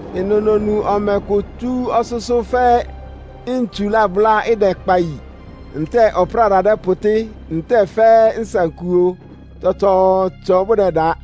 Ɩnʋ nonu ɔmɛ kʋ tsú ɔsʋ́sʋ́ fɛ́ ntsu lábʋ́lá, ɩdɛkpa yi, ntɛ́ɛ ɔpráda dɛ́pʋtɩ́, ntɛ́ɛ fɛ́ nsankuo tsɔtsɔɔtsɔ bʋdɛda.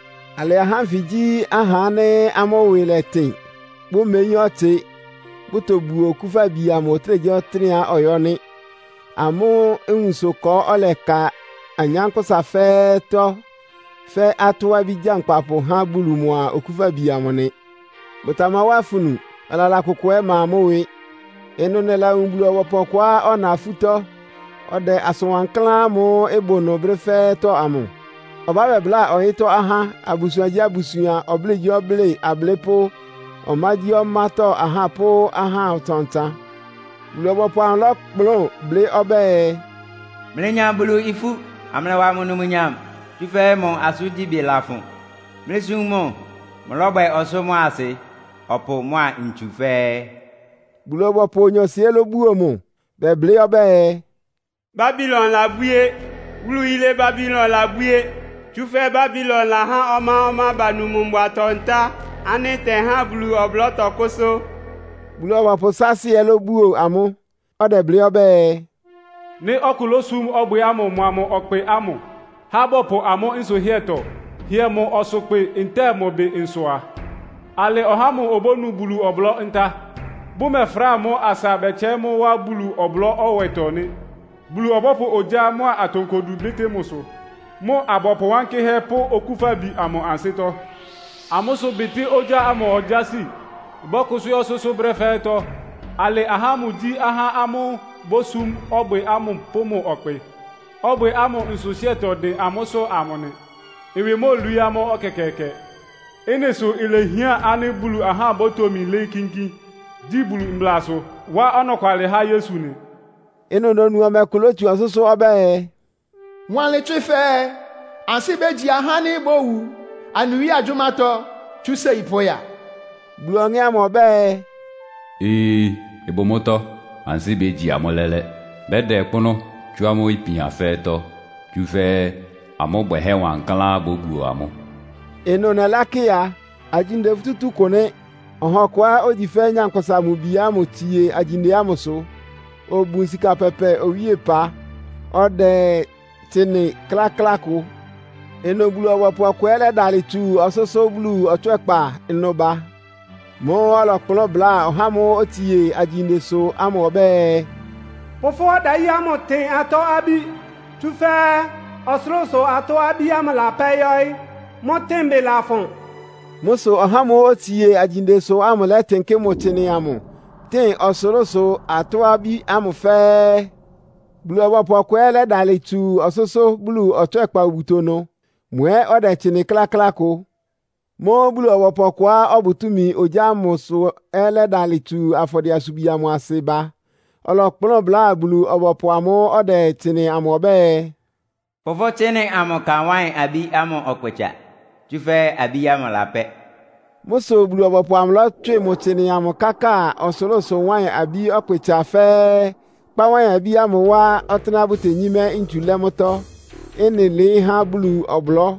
Alɩ ahá ánfɩ gyí ahá ánɩ́ amʋ́ ɩwɩ lɛtɩn, bʋmeyín ɔtsɩ, bʋtobuo Okúfabi amʋ ɔtɩ́nɛgyíɔtɩ́nɛ́á ɔyɔ́ nɩ́. Amʋ́ nwunsʋ ɩkɔ ɔ́lɛka anyánkpʋ́sa fɛ́ɛ́tɔ́, fɛ́ atɔ́-abí gyankpapʋ há Bulu mʋa Okúfabi amʋ nɩ. Bʋtamawá afunu, ɔlala kʋkʋ ɛ́ ɩma amʋ́ ɩwɩ. Ɩnʋ nɛlawun Bulu-ɔbɔpʋ ɔkʋá ɔna afútɔ́, ɔdɛ asʋn wankláán ámʋ́ʋ́ ɩbʋ nʋ brɛ́ fɛ́ɛ́tɔ́ amʋ. Ɔbá bɛbláa ɔyɩ́tɔ́ ahá, abusuangyíabusuan, ɔblɩ́ɩgyíɔblɩ́ɩ ablɩ́pʋ́, ɔmágyíɔmátɔ́ ahá pʋ́ ahá ɔtsan-ɔtsan. Bulu-ɔbɔpʋ amʋ lɔ́kplʋn blɩ́ ɔbɛ́ɛ, “Mlɩnya Bulu ifú, amlɩwa mʋ numnyam, tsúfɛ́ mʋ asʋ́ngyíbɩ lafʋn. Mlɩsum mʋ. Mʋlɔ́bwɛ ɔsʋ́ mʋ́a asɩ, ɔpʋ mʋ́a ntsu fɛ́ɛ́!” Bulu-ɔbɔpʋ onyɔɔsɩ ɛ́ lóbuo mʋ, bɛblɩ́ ɔbɛ́ɛ, “Babilon labwíé. Wúlu yilé Babilon labwíé. Tsúfɛ́ Babilon lahá ɔmá-ɔmá banu mʋ mbʋatɔ-ntá ánɩ́ ɩtɛhá Bulu ɔblɔ́ tɔkʋ́sʋ́!” Bulu-ɔbɔpʋ saasɩ ɛ́ búo amʋ́, ɔdɛblɩ́ ɔbɛ́ɛ, “Nɩ́ ɔkʋ lósum ɔbwɩ ámʋ mʋa mʋ ɔkpɩ ámʋ, há bɔpʋ amʋ́ nsʋhɩ́ɛtɔ hɩɛ mʋ ɔsʋkpɩ ntɛ́ɛ mʋ ɩbɩ nsʋ a, alɩ ɔhá ámʋ obónu Bulu ɔblɔ́-ntá, bʋmɛfráa mʋ́ asa bɛtsɛɩ́ mʋ́ wá Bulu ɔblɔ́-ɛwɛtɔ nɩ́. Bulu ɔbɔ́pʋ ogyá mʋ́a atonkodu bɩ́tɩ́ mʋ ɩsʋ, mʋ abɔpʋ wankɩ́hɛ́ pʋ́ Okúfabi amʋ ansɩ́tɔ́. Amʋ́ ɩsʋbɩtɩ́ ogyá ámʋ ogyási bɔ́kʋsʋ́ yɔ́ ɔsʋ́sʋ́ brɛ́ fɛ́ɛ́tɔ́. Alɩ ahá ámʋ gyí ahá ámʋ́ʋ́ bosúm ɔbwɩ ámʋ pʋ́ mʋ ɔkpɩ, ɔbwɩ ámʋ nsʋhɩ́ɛtɔ dɩn amʋ́sʋ́ ámʋ nɩ. Ɩwɩ móolwií amʋ́ ɛkɛkɛɛkɛ.” Ɩ́nɩ sʋ́ ilehián ánɩ́ Bulu ahá bótomi lɩ́ɩ́ kínkín, gyi Bulu mblasʋ, wá ɔnɔkwalɩ há Yesu nɩ. Ɩnʋ nonu ɔmɛ kʋ lótsu ɔsʋ́sʋ́ ɔbɛ́ɛ, “Wanlɩn tswɩ fɛɛ, ‘Ansɩ́ bégyi ahá ánɩ́ bówu anɩ Wíe agyʋ́mátɔ́ tsú séi pʋ́ya!’” Bulu Ɔŋɛ́ ámʋ ɔbɛ́ɛ, “Ee, ɩbʋ mʋ́tɔ́. Ansɩ́ bégyi amʋ́ lɛ́lɛ́. Bɛ́da ɔkpʋ́nʋ́ tsú amʋ́ ipian fɛ́ɛ́tɔ́, tsúfɛ́ amʋ́ bwɛhɛ́ wankláán bóbuo amʋ́.” Ɩnʋ nɛlákɩ a, agyinde futútú kʋ nɩ́. Ɔha ɔkʋá ogyi fɛ́ Nyankpʋsa-Mʋ-Bi ámʋ tsie agyinde ámʋsʋ. Obun sika pɛpɛ owíepa, ɔdɛ tsɩnɩ kláklá kʋ. Ɩnʋ Bulu-ɔbɔpʋ ɔkʋ ɛ́ lɛ́dalɩ tsu ɔsʋ́sʋ́ Bulu ɔtswɛ́kpa ɩnʋ ba. Mʋ́ʋ́ ɔlɔkplʋ́n bláa ɔhá ámʋ́ʋ́ otsie agyindesʋ ámʋ ɔbɛ́ɛ, “Pʋ fʋ́ ɔdayí ámʋ tɩn atɔ́-abí, tsúfɛ́ ɔsʋlʋ́sʋ atɔ́-abí lapɛ́ yɔ́ɩ́. Mʋ́ tɩ́nbɩ lafʋn!” Mʋ́ sʋ ɔhá ámʋ́ʋ́ otsie agyindesʋ ámʋ lɛ́tɩnkɩ́ mʋ tsɩnɩ amʋ, tɩn ɔsʋlʋ́sʋ atɔ́-abí ámʋ fɛ́ɛ́. Bulu-ɔbɔpʋ ɔkʋ ɛ́ lɛ́dalɩ tsu ɔsʋ́sʋ́ Bulu ɔtswɛ́kpa obuto ɩnʋ. Mʋ ɛ́ ɔdɛ tsɩnɩ kláklá kʋ. Mʋ́ʋ́ Bulu-ɔbɔpʋ ɔkʋá ɔbʋ túmi ogyá ámʋsʋ ɛ́ lɛ́dalɩ tsu afɔdɩɛ-asubwi ámʋ asɩ ba. Ɔlɔkplʋ́n bláa Bulu-ɔbɔpʋ amʋ́ʋ́ ɔdɛ tsɩnɩ ámʋ ɔbɛ́ɛ, “Pʋ fʋ́ tsɩnɩ amʋ ka wáɩn-abí ámʋ ɔkpɩtsa, tsúfɛ́ abí ámʋ ɩlapɛ́.” Mʋ́ sʋ Bulu-ɔbɔpʋ amʋ lɔ́tswɩ mʋ tsɩnɩ amʋ káka ɔsʋlʋ́sʋ wáɩn-abí ɔkpɩtsa fɛ́ɛ́, kpá wáɩn-abí ámʋ wá ɔtɩ́nɛ́á bʋtenyímɛ́ ntsu lɛ́ mʋ́tɔ́. Ɩ́nɩ ɩlɩɩ́ há Bulu ɔblɔ́.